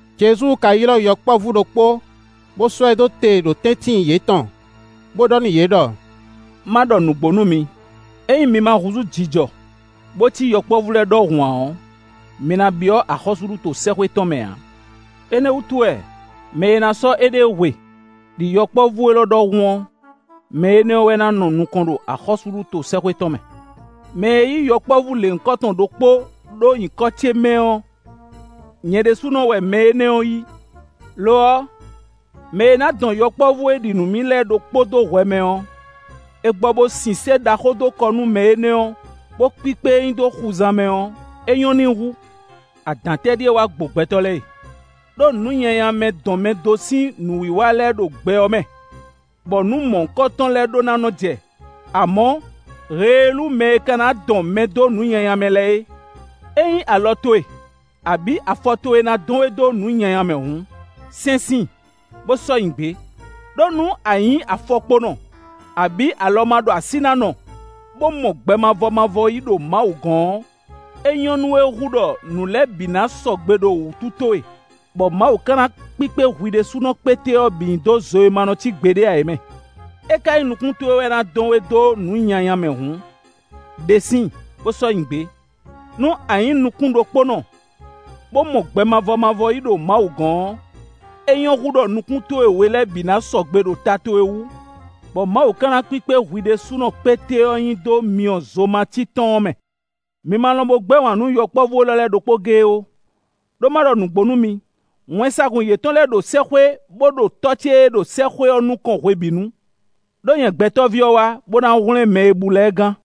Jezu ka ylɔ́ yɔkpɔ́vú ɖokpó, bó sɔ́ ɛ ɖó te ɖo tɛ́ntin yětɔn, bó ɖɔ nú yě ɖɔ: “Má ɖɔ nǔgbó nú mi; ényí mi ma húzú jijɔ, bó cí yɔkpɔ́vú lɛ́ɛ ɖɔhun ǎ ɔ́, mi ná byɔ́ axɔ́súɖuto sɛ́xwé tɔn mɛ ǎ. Énɛ́ wútu wɛ, mɛ e ná sɔ́ éɖée hwe, ɖi yɔkpɔ́vú élɔ́ ɖɔhun ɔ́, mɛ énɛ́ ɔ́ wɛ ná nɔ nukɔn ɖo axɔ́súɖuto sɛ́xwé tɔn mɛ. Mɛ e yí yɔkpɔ́vú lěhunkɔtɔn ɖokpó ɖó nyǐkɔ ce mɛ ɔ́, nyɛ ɖésúnɔ wɛ mɛ énɛ́ ɔ́ yí. “Lo ɔ́, mɛ e ná dɔn yɔkpɔ́vú e ɖi nǔ nú mì lɛ́ɛ ɖokpó dó hwɛ mɛ ɔ́, è gbɔ bó sin sé ɖaxó dó kɔ nú mɛ énɛ́ ɔ́, bó kpíkpé e nyi xuzan mɛ ɔ́, é nyɔ́ n'i hú. Adǎn tɛ́ ɖíe wá gbo gbɛtɔ́ lɛ́ɛ e! Ɖó nǔnyanyamɛ-dɔnmɛdó sín nǔwiwa lɛ́ɛ ɖo gbɛ ɔ́ mɛ, bɔ nǔ mɔ̌hunkɔtɔn lɛ́ɛ ɖó ná nɔ́ jɛ, amɔ̌, heelú mɛ e ka ná dɔn mɛ dó nǔ nyanya mɛ lɛ́ɛ é. “Ényí alɔ towe, abǐ afɔ towe ná dɔn we dó nǔ nyanya mɛ hǔn, sɛ́n síin, bó sɔ́ nyi gbě; ɖó nú a nyǐ afɔkponɔ, abǐ alɔmaɖoasínánɔ, bó mɔ gbɛ mavɔ mavɔ yí ɖo Mawu gɔ́n ɔ́, é nyɔ́ nú we hú ɖɔ nǔ lɛ́ɛ bǐ na sɔgbe ɖo wútu towe, bɔ Mawu ka ná kpíkpé hwi ɖésúnɔ kpéte ɔ́ bǐ nyi dó zo e ma nɔ cí gbeɖé ǎ é mɛ. É ka nyí nukún towe wɛ ná dɔn we dó nǔ nyanya mɛ hǔn, ɖe síin, bó sɔ́ nyi gbě. Nú a nyǐ nukún ɖokpónɔ, bó mɔ gbɛ mavɔ mavɔ yí ɖo Mawu gɔ̌n ɔ́, é nyɔ́ hú ɖɔ nukún towe we lɛ́ɛ bǐ ná sɔgbe ɖo ta towe wú, bɔ Mawu ka ná kpíkpé hwi ɖésúnɔ kpéte ɔ́ nyi dó myɔ zojimací tɔn ɔ́ mɛ.” “Mi ma lɔn bo gbɛ́ wǎn nú yɔkpɔ́vú élɔ́ lɛ́ɛ ɖokpó géé ó. Ɖó má ɖɔ nǔgbó nú mi: wɛnsagun yětɔn lɛ́ɛ ɖo sɛ́xwé bó ɖo Tɔ́ ce e ɖo sɛ́xwé ɔ́ nukɔn hwebǐnu. [ Ɖó nyɛ Gbɛtɔ́ví ɔ́ wá, bó ná hwlɛ́n mɛ e bú lɛ́ɛ gán.]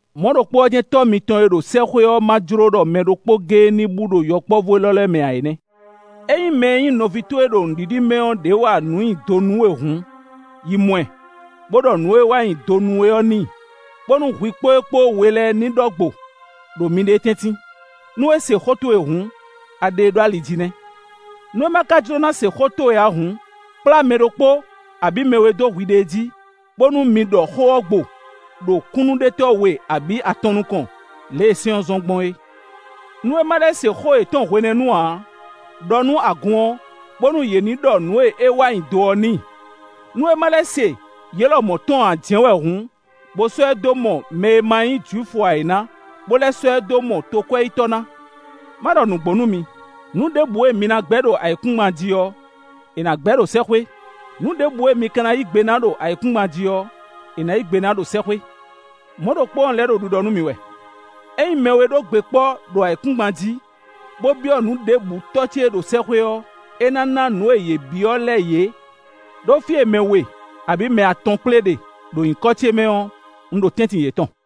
Mɔ̌ ɖokpó ɔ́ jɛ́n wɛ Tɔ́ mitɔn e ɖo sɛ́xwé ɔ́ ma jló ɖɔ mɛ ɖokpó géé ní bú ɖo yɔkpɔ́vú élɔ́ lɛ́ɛ mɛ ǎ é nɛ́.” “Ényí mɛ e nyí nɔví towe ɖo nǔɖiɖi mɛ ɔ́ ɖě wa nǔ nyi do nú we hǔn, yi mɔ ɛ, bó ɖɔ nǔ e é wa nyi do ɔ́ n'i, bónú hwi kpó é kpó we lɛ́ɛ ní ɖɔ gbo, ɖo miɖée tɛ́ntin. Nú é se xó towe hǔn, a ɖe e ɖó ali jí nɛ́. Nú é ma ka jló ná se xó towe ǎ hǔn, kplá mɛ ɖokpó abǐ mɛ we dó hwiɖée jí, bónú mi ɖɔ xó ɔ́ gbo, ɖo kúnnuɖetɔ́ we abǐ atɔn nukɔn, lě e sɛ́n ɔ́ zɔ́n gbɔn é. Nú é ma lɛ́ se xó yětɔn hwenɛ́nu ǎ ɔ́, ɖɔ nú agun ɔ́, bónú yě ní ɖɔ nǔ e é wa nyi do ɔ́ n'i; nú é ma lɛ́ se yě lɔmɔ̌ tɔn ǎ jɛ́n wɛ hǔn, bó sɔ́ ɛ dó mɔ mɛ e ma nyí Jwifu ǎ é ná, bó lɛ́ sɔ́ ɛ dó mɔ tokwɛ́yítɔ́ ná. “Má ɖɔ nǔgbó nú mi; nǔ ɖěbǔ e mi ná gbɛ́ ɖo ayǐkúngban jí ɔ́, è nǎ gbɛ́ ɖo sɛ́xwé; nǔ ɖěbǔ e mi ka ná yí gbe ná ɖo ayǐkúngban jí ɔ́, è nǎ yí gbe ná ɖo sɛ́xwé. “Mɔ̌ ɖokpó ɔ́, un lɛ́ ɖo ɖiɖɔ nú mi wɛ: ényí mɛ we ɖó gbe kpɔ́ ɖo ayǐkúngban jí, bó byɔ́ nǔ ɖěbǔ Tɔ́ ce e ɖo sɛ́xwé ɔ́, é ná ná nǔ e yě byɔ́ lɛ́ɛ yě. Ɖó fí e mɛ we, abǐ mɛ atɔn kplé ɖe, ɖo nyǐkɔ ce mɛ ɔ́, un ɖo tɛ́ntin yětɔn.”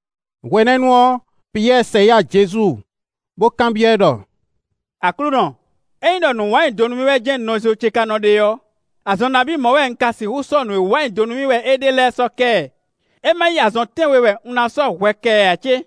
Hwenɛ́nu ɔ́, Piyɛ́ɛ sɛ yá Jezu, bó kanbyɔ́ ɛ ɖɔ: “Aklúnɔ! Ényí ɖɔ nǔ wa nyi do nú mì wɛ jɛ́n nɔzo ce ka nɔ ɖe ɔ́, azɔn nabí mɔ̌ wɛ un ka sixú sɔ́ nǔ e wa nyi do nú mì wɛ é ɖe lɛ́ɛ sɔ́ kɛ ɛ? É má nyí azɔn tɛ́nwe wɛ un ná sɔ́ hwɛ kɛ ɛ ǎ cé?”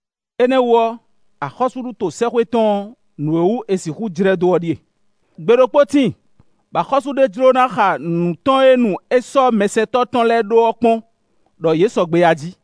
Énɛ́ ɔ́ wú ɔ́, axɔ́súɖuto sɛ́xwé tɔn ɔ́, nǔ e wú è sixú jlɛ́ dó ɔ́ ɖíe: gbe ɖokpó tíin, bɔ axɔ́sú ɖé jló ná xa nǔ tɔn e nu é sɔ́ mɛsɛntɔ́ tɔn lɛ́ɛ ɖó ɔ́ kpɔ́n, ɖɔ yě sɔgbe a jí.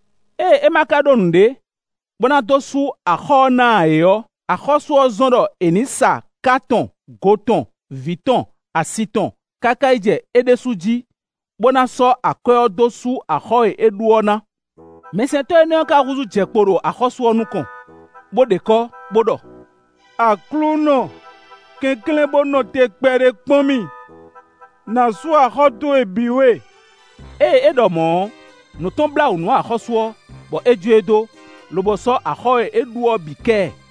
Ée é ma ka ɖó nǔɖé, bó ná dó sú axɔ́ ɔ́ ná ǎ é ɔ́, axɔ́sú ɔ́ zɔ́n ɖɔ è nǐ sa ka tɔn go tɔn, vǐ tɔn, asi tɔn káká yi jɛ é ɖésú jí, bó ná sɔ́ akwɛ́ ɔ́ dó sú axɔ́ è é ɖu ɔ́ ná. Mɛsɛntɔ́ énɛ́ ɔ́ ka húzú jɛ kpo ɖo axɔ́sú ɔ́ nukɔn, bó ɖe kɔ́, bó ɖɔ: ‘Aklúnɔ! Kɛnklɛ́n bó nɔ te kpɛɖé kpɔ́n mì; nǎ sú axɔ́ towe bǐ we.’ Ée é ɖɔ mɔ̌ ɔ́, nǔ tɔn blá wǔ nú axɔ́sú ɔ́, bɔ é jó e dó, lobo sɔ́ axɔ́ e é ɖu ɔ́ bǐ kɛ ɛ.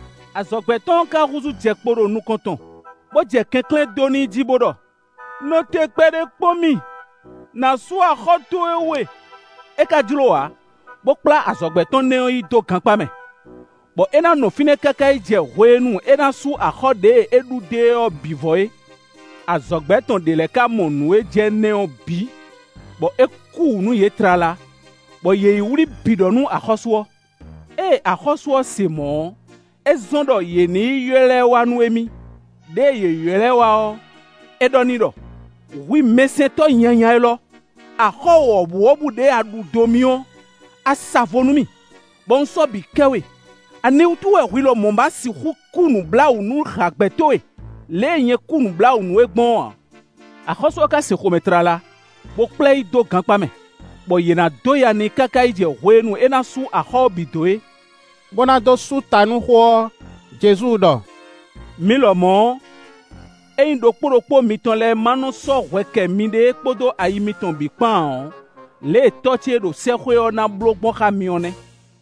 Azɔ̌gbɛ́ tɔn ɔ́ ka húzú jɛ kpo ɖo nukɔn tɔn, bó jɛ kɛnklɛ́n dó n'i jí, bó ɖɔ: ‘Nɔ te kpɛɖé kpɔ́n mì; nǎ sú axɔ́ towe we;’ é ka jló ǎ, bó kplá azɔ̌gbɛ́ tɔn nɛ́ ɔ́ yi dó gankpá mɛ, bɔ é ná nɔ fínɛ́ káká yi jɛ hwenu e é ná sú axɔ́ ɖěe é ɖu dó e ɔ́ bǐ vɔ é. Azɔ̌gbɛ́ tɔn ɖě lɛ́ɛ ka mɔ nǔ e jɛ nɛ́ ɔ́ bǐ, bɔ é kú wǔ nú yě tlala, bɔ yě yi wlí bǐ ɖɔ nú axɔ́sú ɔ́. Ée axɔ́sú ɔ́ se mɔ̌ ɔ́, é zɔ́n ɖɔ yě ní yi ylɔ́ ɛ wá nú émí; ɖěe yě ylɔ́ ɛ wá ɔ́, é ɖɔ n'i ɖɔ: ‘Hwi mɛsɛntɔ́ nyanya élɔ́, axɔ́ wɔ̌buwɔ́bú ɖěe a ɖu dó mì ɔ́, a sa vo nú mì, bɔ un sɔ́ bǐ kɛ we; aniwútu wɛ hwi lɔmɔ̌ ma sixú kú nǔbláwǔ nú hǎgbɛ́ towe, lě e nyɛ kú nǔbláwǔ nú we gbɔn é ǎ?’ Axɔ́sú ɔ́ ka sin xomɛ tlala, bó kplá ɛ yi dó gankpá mɛ, bɔ yě ná dó ya n'i káká yi jɛ hwenu e é ná sú axɔ́ ɔ́ bǐ dó é.” Bó ná dó sú ta nú xó ɔ́, Jezu ɖɔ: “Mi lɔmɔ̌ ɔ́, ényí ɖokpó ɖokpó mitɔn lɛ́ɛ ma nɔ sɔ́ hwɛ kɛ miɖée kpódó ayi mitɔn bǐ kpán ǎ ɔ́, lě e Tɔ́ ce e ɖo sɛ́xwé ɔ́ ná bló gbɔn xá mi ɔ́ nɛ́.”